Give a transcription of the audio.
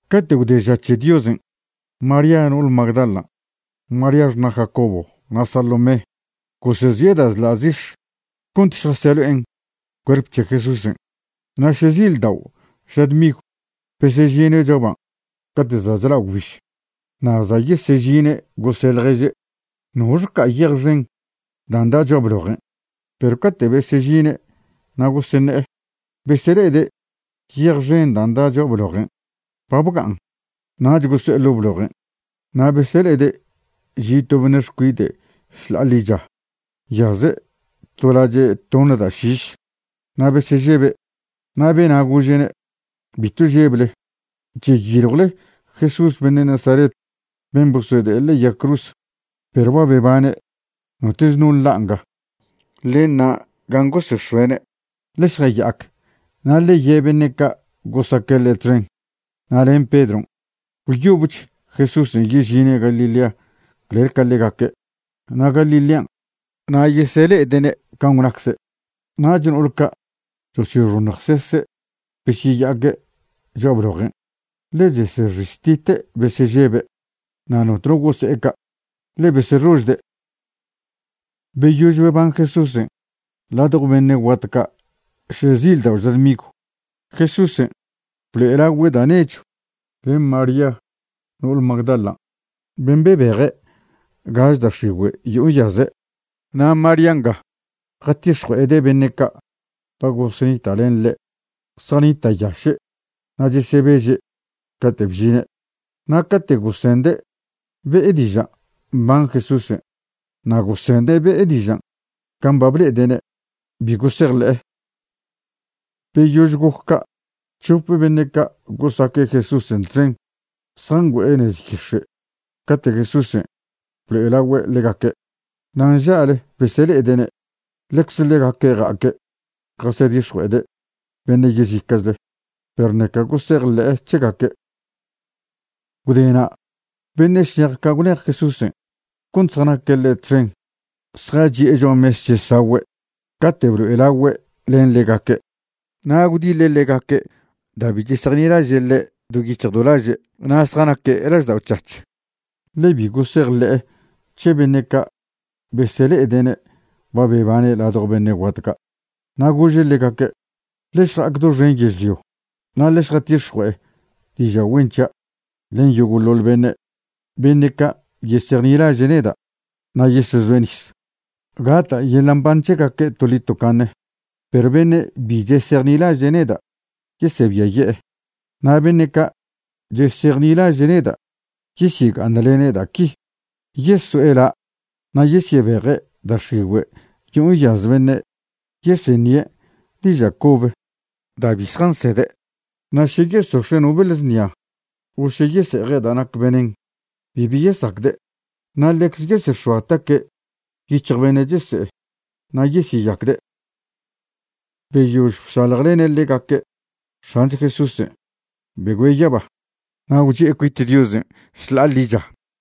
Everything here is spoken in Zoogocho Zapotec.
Cate' gwde ža c̱he Diosen', María no'ole Magdalan', María xṉa' Jacobo, na' Salomé gosezi'e da' chḻa' zix̱ cont šjaselo'en cuerp c̱he Jesúsen'. Na' šezildao' ža dmigw besežine' cho'a ban', cate' za' chla' gwbiž. Na' za' yesežine' gose' ḻježe': ―¿Noxe ca'a yej xen dan' da' cho'a blojen'? Perw cate' besežine' na' goseṉe'e, besele'ede' yej xen dan' da' cho'a blojen' ba bga'an. Nach goso'e ḻo' blojen', na' besele'ede' chi' to beṉe' xcuide' šḻa'a ḻicha, nyaze' to lache' toṉ da' šiš. Na' besežebe'. Na' bena' gože'ne': ―Bitw žeble. Cheyiljwle Jesús beṉe' Nazaret ben' bosode'e ḻe'e yag cruz. Perw ba bebane'; notoch no nḻa' nga. Ḻe ṉa' gan' gosex̱oe'ne'. Ḻe šjaya'ac na' ḻe ye' beṉe' ca' gosaque' ḻe' txen, na' len Pedron', gwyobech Jesúsen' yežine' Galilea clel ca ḻegaque'. Na' Galilean' na' yesele'ede'ne' can' gwnacze'. Nach no'ol ca' chosyoxoṉjsese' besyeya'aque' cho'a blojen', ḻe chesexiztite' besežebe'. Na' notno gose'e ca', ḻe besexožde'. Beyož beban Jesúsen' ladjo beṉe' guat ca' šezildao' ža dmigw, Jesúsen' blo'elagüe' da' nechw len María no'ole Magdalan', ben' bebeje' gaž da' x̱igüe' yo'o nyaze'. Na' María nga jatix̱jue'ede' beṉe' ca' ba gosenita' len ḻe'. Zjanita'yaše' na' chesebeže' cate' bžine'. Na' cate' gosende' be'e diža' mban Jesúsen' na' gosende' be'e dižan' can' ba ble'ede'ne', bi gosejḻe'e. Beyož goc ca', c̱hop beṉe' ca' gosaque' Jesúsen' txen zjangüe'e nez yix̱e' cate' Jesúsen' blo'elagüe' ḻegaque', na' nža'le besele'ede'ne'. Ḻecze ḻegaque' ja'aque' jasedix̱jue'ede' beṉe' yezica'chle, perw ṉeca gosejḻe'e c̱hegaque'. Gwdena' beṉe' šnej ca' gwlej Jesúsen' cont zjanaque' ḻe' txen zjachi'e cho'a mes chesagüe' cate' blo'elagüe' len ḻegaque'. Na' gwdiḻe' ḻegaque' da' bi chesejnilaže' ḻe' do yic̱hj do laže' na' zjanaque' laždao' c̱hac̱h, ḻe bi gosejḻe'e c̱he beṉe' ca' besele'ede'ne' ba bebane' ladjo beṉe' guat ca'. Na' gože' ḻegaque': ―Ḻe šja'ac doxen yežlio, na' ḻe šjatix̱jue'e diža' güen c̱hia' len yogo'ḻoḻ beṉe'. Beṉe' ca' yesejnilaže' neda' na' yesezoe' nis, gata' yeḻa' mban c̱hegaque' toḻi tocaṉe. Perw beṉe' bi chesejnilaže' neda', yesebiaye'e. Na' beṉe' ca' chesejnilaže' neda', yesyega'aṉlene' da' qui: Yeso'e la' na' yesyebeje' da' x̱igüe' yo'o nyaz beṉe'; yeseṉie' diža' cobe da' bi zjansede'; na' še yesox̱e' no beḻ znia, o še yese'eje' da' nac venen, bibi yesacde'; na' ḻecze yesex̱oa taque' yic̱hj beṉe' chese'e na' yesyeyacde'. Beyož bšaljlene' ḻegaque', X̱ancho Jesúsen' begüe' yaba, na' gwchi'e cuit Diosen' šḻa'a ḻicha.